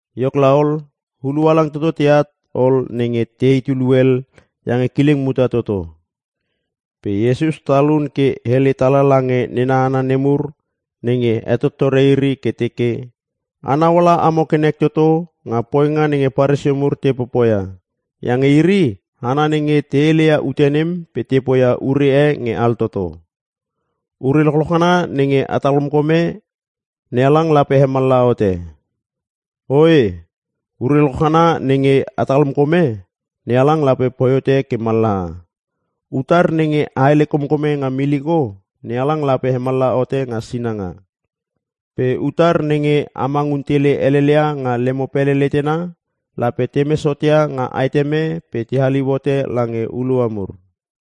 Iok laol, hulua halang toto teat ol nenge te heit ulu hel iange kileng muta toto. Pe Iesus talun ke hele tala lange nena hana nemur nenge hetotore iri ke teke, “Anau ala amo ke nek toto nga poinga nenge Paresio mur te popoia iange iri hana nenge te heleia ute nem pe te poia ure e nge altoto! Ure lochloch ngana nenge a talkomkome NeHalang lape hemallaha hote. Oe, ure lochloch ngana nenge a talkomkome NeHalang lape poi hote ke mallaha. Utar nenge a hele komkome nga miliko NeHalang lape hemallaha hote nga sinanga. Pe utar nenge a mangun tele helel ia nga lemo pele letena lape temes hot ia nga aeteme pe te haliu hote lange hulua mur.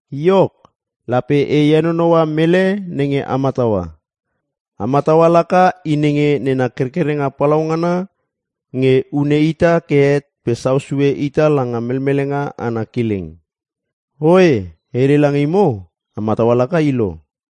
Iok, lape e henonoua mele nenge a mataua. A mataua laka i nenge nena kerkerenga palaungana nge hune ita ke het pe sau sue ita langa melmelenga ana kileng. Oe, e hele lange imo, a mataua laka i lo!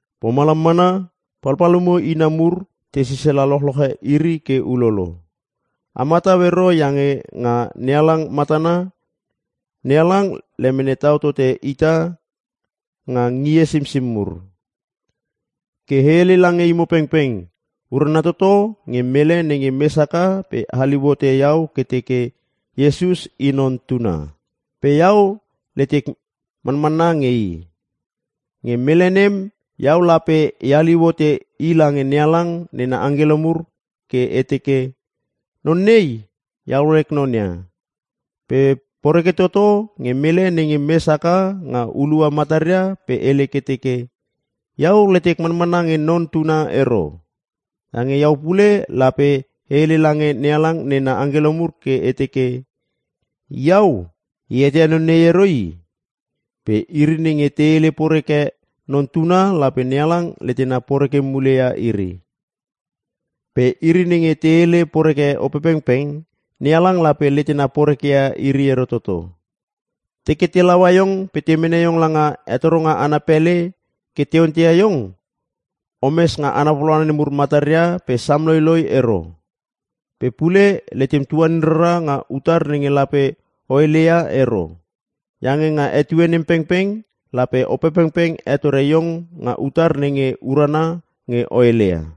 Pomalam mana palpalumo ina mur te sisala lochloche iri ke ulolo. A matau ero iange nga NeHalang matana NeHalang lemene tau tote ita nga ngie simsim mur. “Ke e hele lange imo pengpeng urana toto nge mele nenge mes haka pe haliu hote iau ke teke, ‘Iesus i Non Tuna. Pe Iau letek manmanna nge i.’ Nge mele nem Iau lape e haliu hote i lange NeHalang nena angkelo mur ke e teke, ‘Non nei, iau lek non ia.’ Pe poreke toto nge mele nenge mes haka nga hulua mataria pe hele ke teke, ‘Iau letek manmanna nge Non Tuna ero.’ Iange iau pule lape e hele lange NeHalang nena angkelo mur ke e teke, ‘Iau e eteia non nei ero i.’ Pe iri nenge te hele poreke Non Tuna lape NeHalang letena poreke mule ia iri. Pe iri nenge te hele poreke Opepengpeng, NeHalang lape letena porekeia iri ero toto. “Teke te laua iong pe te mene iong langa hetoronga ana pele ke te onteia iong, omes nga hana papalauna nemur mataria pe sam loiloi ero. Pe pule letem tuanin rara nga utar nenge lape o hele ia ero. Iange nga etue nem pengpeng lape Opepengpeng hetore iong nga utar nenge urana nge o heleia.”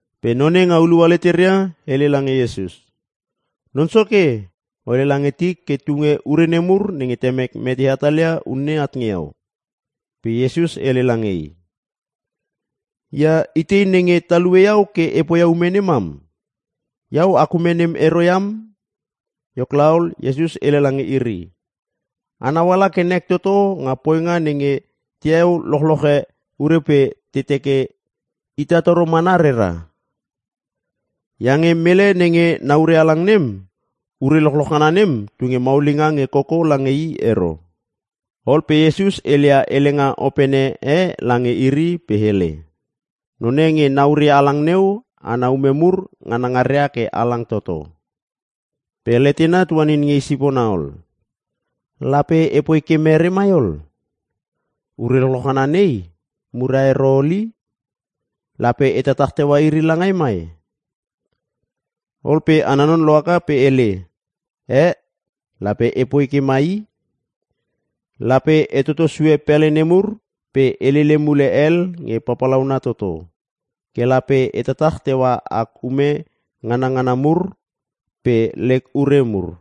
Pe none nga hulua leteria hele lange Iesus, “Non Soke o hele lange tik ke tunge ure nemur nenge temek mete hatalia unne at nge iau.” Pe Iesus hele lange i, “Ia, itei nenge talue iau ke e poia ume nemam? Iau ak ume nem ero iam.” Iok laol, Iesus hele lange iri, “Anau ala ke nek toto nga poinga nenge taeu lochloche ure pe ta teke ita toro mana rera. Iange mele nenge na ure halang nem, ure lochloch ngana nem tunge maulinga nge koko lange i ero.” Ol pe Iesus heleia helenga opene e lange iri pe hele, “Non e nge na ure halang neu ana ume mur nganangaria ke halang toto. Pe letena tuanin nge i sipona ol, ‘Lape epoi ke mere mai ol? Ure lochloch ngana nei muria ero ol i! Lape e tatach teua iri langai mai?’ “Ol pe ana non lohaka pe hele, ‘Eh! lape epoi ke mai i! Lape etoto sue pele nemur pe e lele mule hel nge papalauna toto. Ke lape e tatach teua ak ume nganngana mur pe lek ure mur.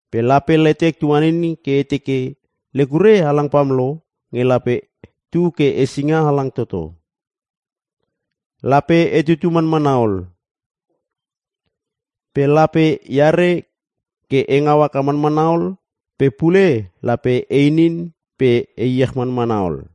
Pe lape letek tuanin ke e teke: Lek ure halang pamlo nge lape tu ke hesinga halang toto. Lape e tutu manmanna ol. Pe lape eare ke e ngau haka manmana ol pe pule lape e inin pe e iech manmana ol!’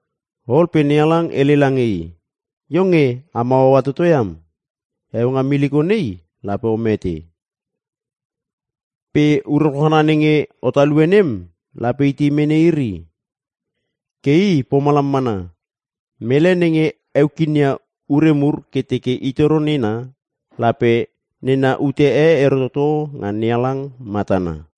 “Ol pe NeHalang hele lange i, ‘Iong nge am hauaua toto iam! Heueu nga miliko nei lape o mete. Pe ure lochloch ngana nenge o talue nem lape itei mene iri?’ “Ke i pomalam mana. Mele nenge heu kinia ure mur ke teke i toro nena, lape nena ute e ero toto nga NeHalang matana.”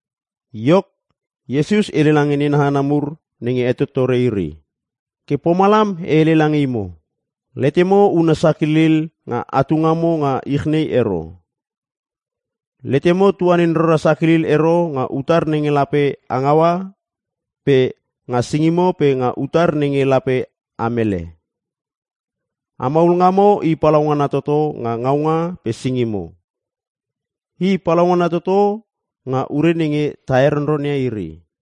Iok, Iesus hele lange nena hana mur nenge hetotore iri, “Ke pomalam e hele lange imo, letemo una sakilil nga atu ngamo nga ich nei ero. Letemo tuanin rara sakilil ero nga utar nenge lape a ngaua pe nga singimo pe nga utar nenge lape a mele. A maul ngamo, i palaungana toto nga ngaunga pe singimo, i palaungana toto nga ure nenge ta heronronia iri.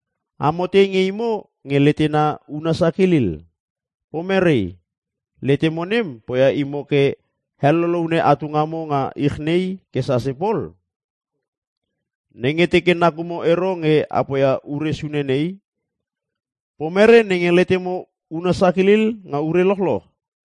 Amo tei nge imo nge letemo una sakilil? Pomere? Letemo nem poia imo ke heloloune atu ngamo nga ich nei ke sase pol? Nenge teke nakumo ero nge a poia ure sune nei, pomere nenge letemo una sakilil nga ure lochloch?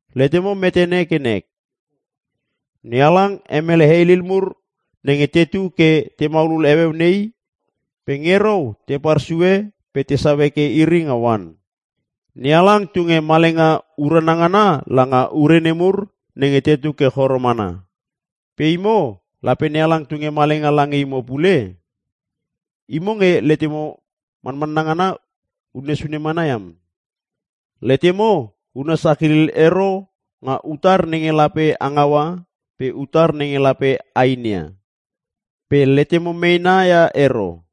Letemo metene ke nek NeHalang hemele heilil mur nenge tetu ke te maulul heueu nei pe nge rou te parsue pe tesau heke iri nga oan. NeHalang tunge malenga urana ngana langa ure nemur nenge tetu ke choro mana. Pe imo lape NeHalang tunge malenga lange imo pule? Imo nge letemo manmanna ngana unne sune mana iam! Letemo una sakilil ero nga utar nenge lape a ngaua pe utar nenge lape a inia. Pe letemo meena ia ero.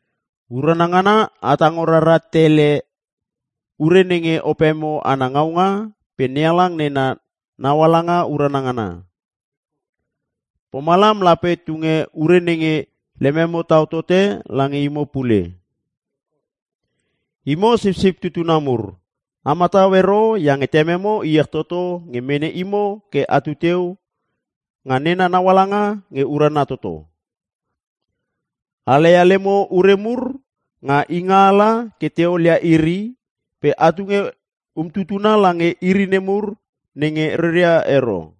Urana ngana a tango rara tele ure nenge opemo ana ngaunga pe NeHalang nena naualanga urana ngana. Pomalam lape tunge ure nenge lememo tau tote lange imo pule. “Imo sipsip tutuna mur a matau ero iange Tememo iech toto nge mene imo ke atu teu nga nena naualanga nge urana toto. A laia lemo ure mur nga ingaala ke te olia iri pe a tunge umtutuna lange iri nemur nenge reria ero.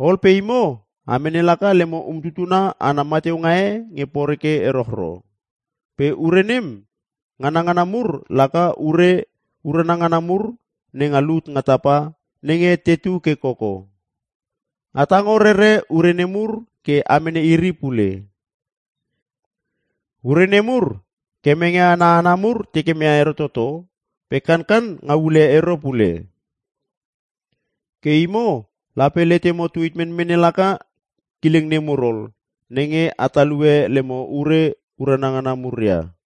Ol pe imo a mene laka lemo umtutuna ana mateunga e nge poreke erochro. Pe ure nem nganangana mur laka ure urana ngana mur nenga lut nga tapa nenge tetu ke koko. A tango rere ure nemur ke a mene iri pule. Ure nemur kemenge ana hana mur tekeme ia ero toto pe kankan ngau ule ero pule. Ke imo lape letemo tuit menmene laka kileng nemur ol nenge a talue lemo ure urana ngana mur ia.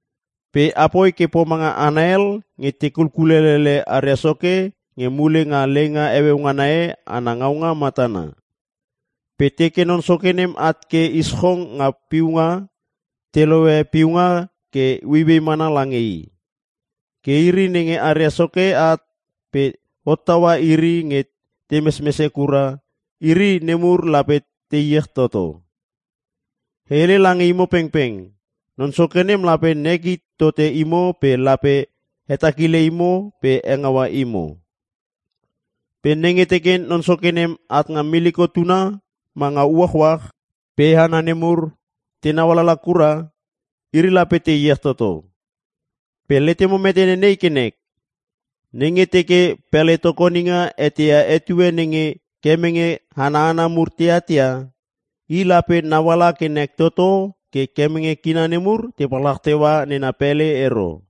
Pe apoi ke pomanga hana hel nge te kulkulelele aria soke nge mule nga leinga heueu ngana e ana ngaunga matana. Pe teke non soke nem at ke ischong nga piunga te lohe piunga ke ueiuei mana lange i. Ke iri nenge aria soke at pe hottaua iri nge te mesmese kura, iri nemur lape te iech toto. E hele lange imo pengpeng non soke nem lape nek hit tote imo pe lape hetakile imo pe hengaua imo. Pe nenge teke Non Soke nem at nga miliko tuna ma nga uachuach pe hana nemur tenau alala kura, iri lape te iech toto. Pe letemo metene nei ke nek; Nenge teke pele tokoninga eteia etue nenge kemenge ana hana mur te atat ia i lape nauala ke nek toto ke kemenge kina nemur te palchach teua nena pele ero.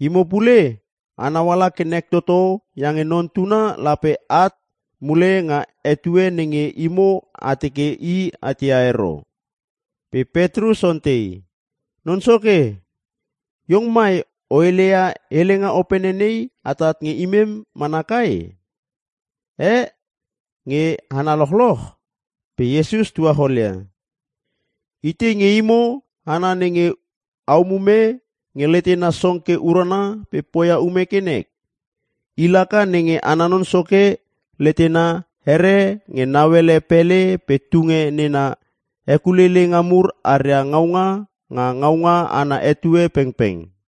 Imo pule a nauala ke nek toto iange Non Tuna lape at mule nga etue nenge imo a teke i atia ero.” Pe Petrus ontei, “Non Soke, iong mai o heleia helenga opene nei atat nge imem mana kai? Eh? Nge hana lochloch?” Pe Iesus tuacholia, “Itei nge imo hana nenge a umume nge letena song ke urana pe poia ume ke nek? I laka nenge ana non soke letena here nge nauele pele pe tunge nena hekuleileinga mur aria ngaunga nga ngaunga ana etue pengpeng.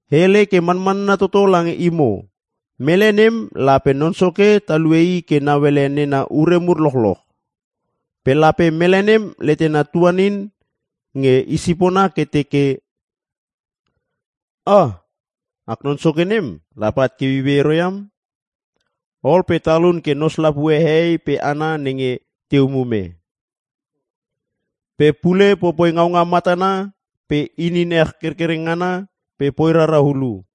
E hele ke manmanna toto lange imo mele nem lape non soke talue i ke nauele nena ure mur lochloch. Pe lape mele nem letena tuaninin nge i sipona ke teke, ‘Ah! Ak non Soke nem lape at ke ueiuei ero iam.’ Ol pe talun ke nos lapue hehei pe hana nenge te umume. Pe pule popoi ngaunga matana pe inin ech kerkereng ngana pe poi rara hulu.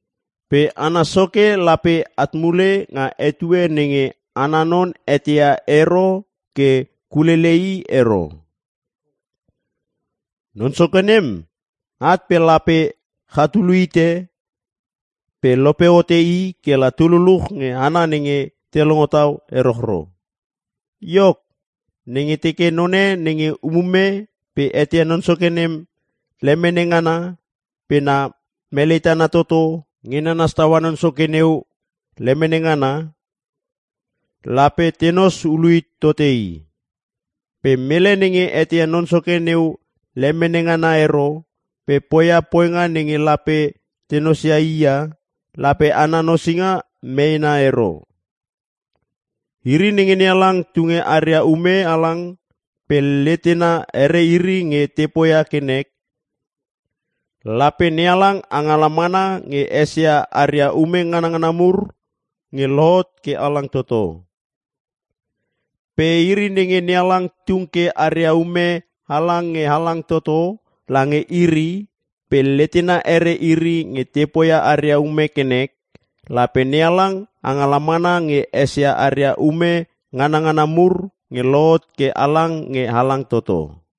Pe ana soke lape at mule nga etue nenge ana non eteia ero ke kulele i ero. Non soke nem at pe lape chatulu hite pe lope hote i kela tu luluch nge hana nenge te longo tau erochro. “Iok, nenge teke none nenge umume pe eteia non soke nem lemene ngana pe na melei tana toto nge nanas taua non soke neu lemene ngana, lape tenos ulu hit tote i. Pe mele nenge eteia non soke neu lemene ngana ero pe poia poinga nenge lape te nosia i ia lape ana nosinga meena ero. Iri nenge NeHalang tunge aria ume halang pe letena here iri nge te poia ke nek, lape NeHalang angala mana nge esia aria ume ngangana mur nge lohot ke halang toto. Pe iri nenge NeHalang tung ke aria ume halang nge halang toto lange iri pe letena here iri nge te poia aria ume ke nek, lape NeHalang angala mana nge esia aria ume nganangana mur nge lohot ke halang nge halang toto.”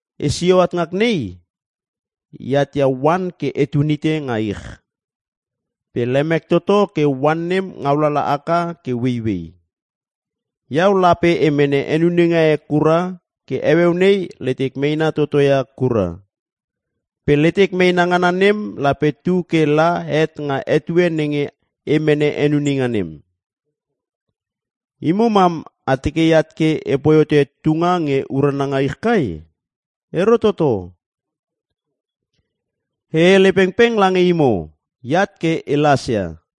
“Esio at ngak nei. E atia oan ke etun hite nga ich. Pe lemek toto ke oan nem ngaulala haka ke ueiuei. Iau lape e mene henuninga e kura ke heueu nei letek meena toto ia kura. Pe letek meena ngana nem lape tu ke la het nga etue nenge e mene henuninga nem. Imo mam a teke eat ke epoi hote tunga nge urana nga ich kai? Ero toto! E hele pengpeng lange imo eat ke e lasia.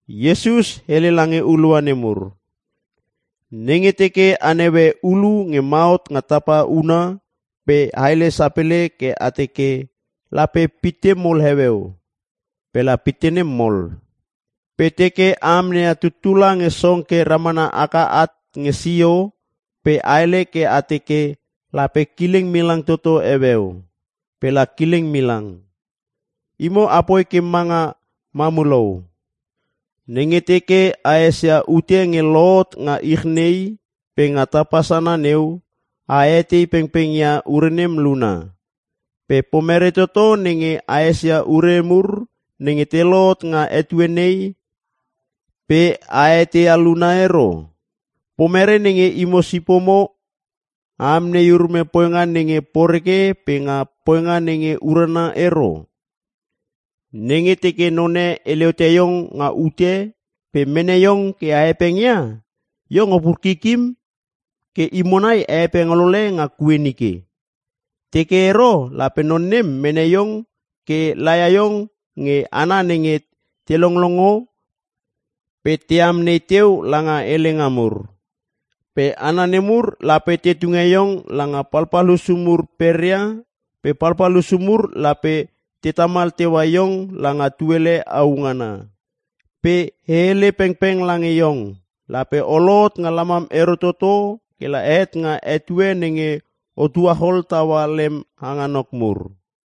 Iesus hele lange hulua nemur, “Nenge teke a naue ulu nge ma hot nga tapa huna pe a hele sapele ke a teke, ‘Lape pitte mol heueu.’ Pe la pitte nem mol. Pe teke a amneia tutula nge song ke ramana haka at nge sio pe a hele ke a teke, ‘Lape kileng milang toto heueu.’ Pe la kileng milang. Imo apoi ke manga mamulou! Nenge teke a esia ute nge lohot nga ich nei pe nga tapa sana neu pe a etei pengpeng ia ure nem luna. Pe pomere toto nenge a esia ure mur nenge te lohot nga etue nei pe a eteia luna ero? “Pomere nenge imo sipomo a amnei urume poinga nenge poreke pe nga poinga nenge urana ero? Nenge teke none hele ote iong nga ute pe mene iong ke a hepengia, iong opur kikim ke imo nai a hepeng olole nga kue nike. Teke ero lape non nem mene iong ke laia iong nge hana nenge te longlongo pe te amnei teu langa helenga mur. Pe hana nemur lape te tunge iong langa palpal hussu mur peria pe palpal hussu mur lape te tamal teua iong langa tuele au ngana. Pe e hele pengpeng lange iong lape o lohot nga lamam ero toto ke la het nga etue nenge o tuachol taua lem hangonok mur.”